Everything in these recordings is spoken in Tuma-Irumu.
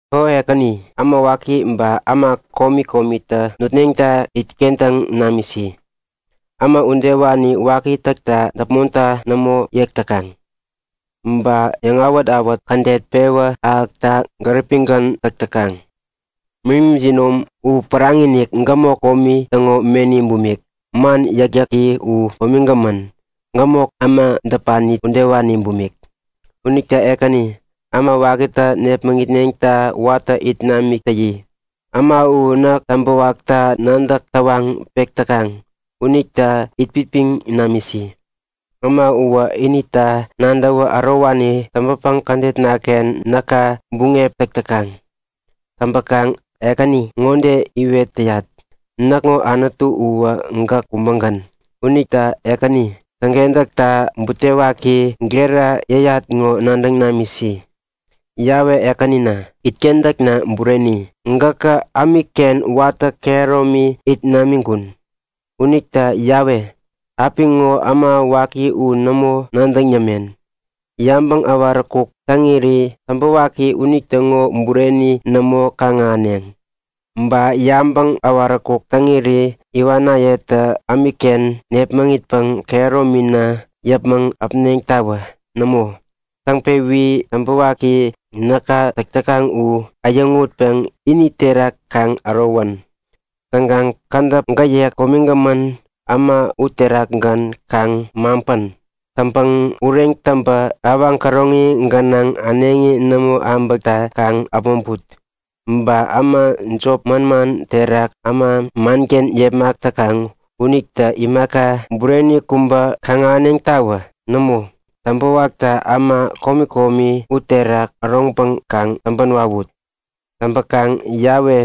O Ekäni, äma waki ba äma komi komitä nutneŋta itkentäŋ namisi. Äma udewani waki täkta däpmonta nämo yek täkaŋ. Ba yäŋawät-awät kädet pewä ahäkta gäripigän täk täkaŋ. Meni jinom u päraŋi-inik, gämok komi täŋo meni bumik. Man yäkyäki u komigämän, gämok äma däpani udewani bumik. Unita Ekäni, äma wakitä nepmäŋitneŋta watä it namik täyi. Äma u näk täŋpäwakta nadäk tawaŋ pek täkaŋ unita itpipiŋ namisi. Äma uwä inita nadäwä ärowani täŋpäpäŋ kädetnaken näka buŋep täk täkaŋ. Täŋpäkaŋ Ekäni ŋode iwet täyat; Näkŋo Anutu uwä gäk kubägän. Unita Ekäni, täŋkentäkta butewaki gera yäyat ŋo nadäŋ namisi. Yawe Ekänina, itkentäkna bureni, gäkä ämikken watä kehäromi it namiŋkun. Unita Yawe, apiŋo äma waki u nämo nadäŋ yämen. Yabäŋ äwaräkuk täŋiri täŋpäwaki unitäŋo bureni nämo kaŋ-ahäneŋ. Ba yabäŋ äwaräkuk täŋiri iwanayetä ämikken närepmitpäŋ kehäromina yäpmäŋ äpneŋtawä. Nämo, täŋpewi täŋpäwaki näka täk täkaŋ u äyäŋutpäŋ ini terak kaŋ ärowän. Täŋkaŋ kädäp gäyek komigämän äma uterakgän kaŋ maŋpän! Täŋpäŋ ureŋ täŋpä awaŋ käroŋi gänaŋ, äneŋi nämo abäkta, kaŋ äpmoŋput. Ba äma jop manman terak äma manken yepmak täkaŋ unitä imaka bureni kubä kaŋ-ahäneŋtawä. Nämo, täŋpäwaktä äma komi komi uterak äroŋpäŋ kaŋ täŋpän wawut! Täŋpäkaŋ Yawe,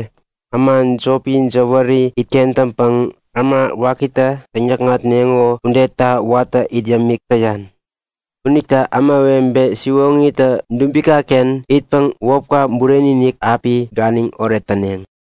äma jopi jäwäri itkentäŋpäŋ äma wakitä täŋyäkŋatneŋo udeta watä it yämik täyan. Unita ämawebe siwoŋitä dubikaken itpäŋ wäpka bureni-inik api ganiŋoret täneŋ.